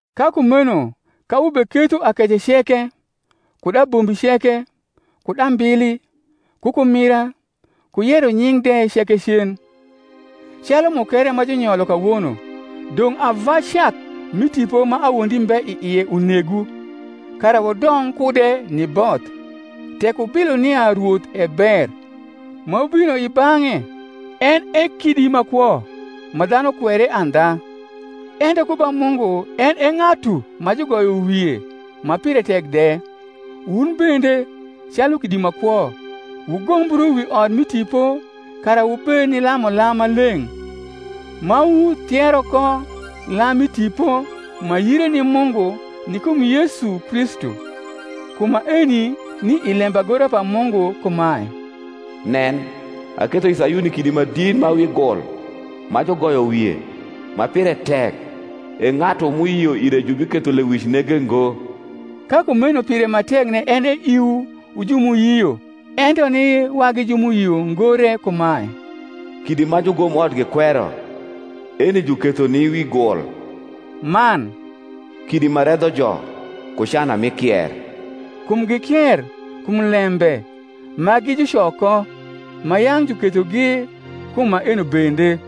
Ka kumeno ka wubeketho akece ceke, kud abombi ceke, kud ambili, ku kumira, ku yeronying’ de ceke cen, calu mukere ma junyolo kawono, dong’ ava cak mi tipo ma awondi mbe i ie unegwu, kara wudong kude ni both; tek wubilo nia Rwoth e ber; ma wubino i bang’e, en e kidi ma kwo, ma dhanu kwere andha, ento ku ba Mungu en e ng’atu ma jugoyo wie, ma pire tek de, wun bende, calu kidi ma kwo, wugombru wi ot mi tipo, kara wubed ni lamulam ma leng’, ma wuthiero ko lam mi tipo, ma yire ni Mungu ni kum Yesu Kristu. Kum maeni ni i lembagora pa Mungu kumae, Nen, aketho i Sayuni kidi ma dit ma wi gul, ma jugoyo wie, ma pire tek: E ng’atu m’uyio ire jubiketho lewic nege ngo. Ka kumeno pire ma tekne en e iwu wu ju m’uyio: ento ni wagi ju m’uyio ngo re kumae, Kidi ma jugomot gikwero, Eni juketho ni wi gul; man, Kidi ma redho jo, ku cana mi kier; kum gikier kum lembe, ma gi juco ko; ma yang’ jukethogi kum maeno bende.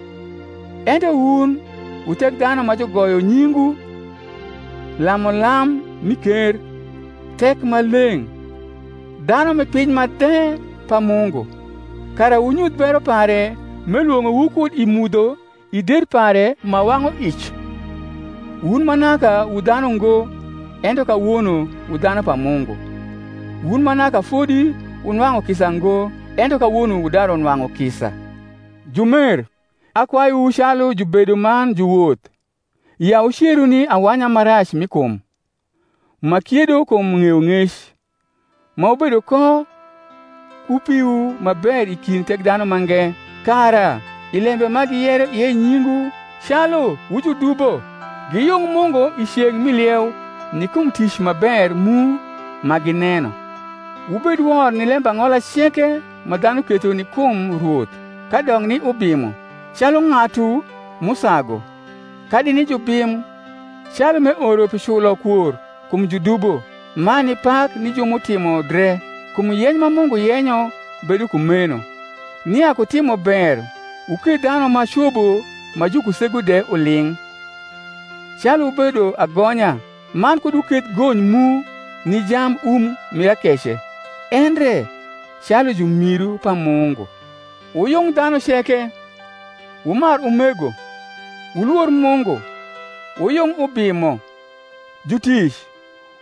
Ento wun wu thekdhanu ma jugoyo nyingwu, lamulam mi ker, thek ma leng’, dhanu mi piny ma dhe pa Mungu, kara wunyuth bero pare m’elwong’owu kud i mudho i der pare ma wang’uic: wun ma naka wu dhanu ngo, ento kawono wu dhanu pa Mungu: wun ma naka fodi wunwang’u kisa ngo, ento kawono wudaru nwang’u kisa. Jumer, akwayuwu calu jubedo man juwoth, ya wuceru ni awanya ma rac mi kum, ma kiedo kum ng’eyong’ec; ma wubedo ko ku piwu ma ber i kind Thekdhanumange; kara, i lembe ma giyero ie nyingwu calu wu judubo, giyung Mungu i ceng’ mi lieu, ni kum tic ma ber mu ma gineno. Wubed wor ni lembang’ola ceke ma dhanu ketho ni kum Rwoth: kadok ni ubimo, calu ng’atu m’usagu; kadi ni jubim, calu m’eoro pi culokwor kum judubo man ni pak ni ju m’utimo dre. Kum yeny ma Mungu yenyo bedo kumeno, nia ku timober wuketh dhanu ma cobo ma jukusegu de uling’: calu wubedo agonya, man kud wuketh gony mu ni jambum mir akece, endre calu jurniru pa Mungu. Wuyung dhanu ceke. Wumar umego. Wulwor Mungu. Wuyung ubimo. Jutic,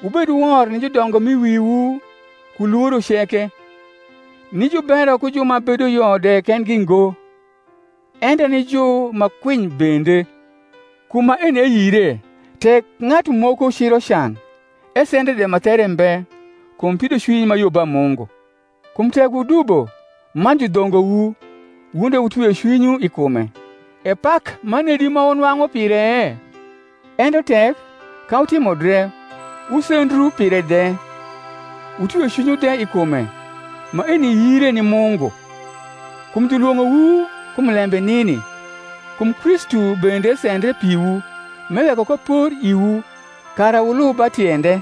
wubed wor ni judongo m’i wiwu ku lworo ceke; ni jubero ku ju ma bedo yo de kendgi ngo, ento ni ju ma kwiny bende. Kum maeni e yire, tek ng’atu moko ciro can, esendre de ma there mbe, kum pidocwiny ma yo ba Mungu. Kum tek wudubo, man judhongowu, wun de wutwio cwinywu i kume, e pak ma nedi ma wunwang’u pire? ento tek, ka wutimo dre, wusendru pire de, wutwio cwinywu de i kume, maeni yire ni Mungu. Kum jniwong’owu kum lembe nini: kum Kristu bende sendre piwu, m’eweko ko por iwu, kara wniub ba tiende: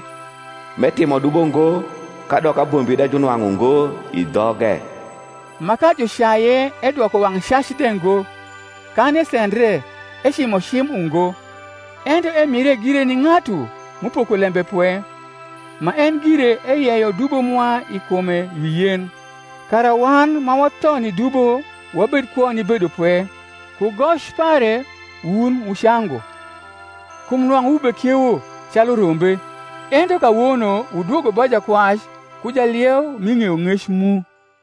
m’etimo dubo ngo, kadok abombi de junwang’u ngo i dhoge: ma, ka jucaye edwoko wang’ cac de ngo; kan esendre, ecimo cim ungo; ento emire gire ni ng’atu m’upoko lembe pwe: ma en gire eyeyo dubo mwa i kume wi yen, kara wan, ma watho ni dubo, wabed kwo ni bedopwe; ku goc pare wun wucangu. Kum nwang’u wubekiewo calu rombe; ento kawono wudwogo ba Jakwac ku Jalieu mi ng’eyong’ec mu.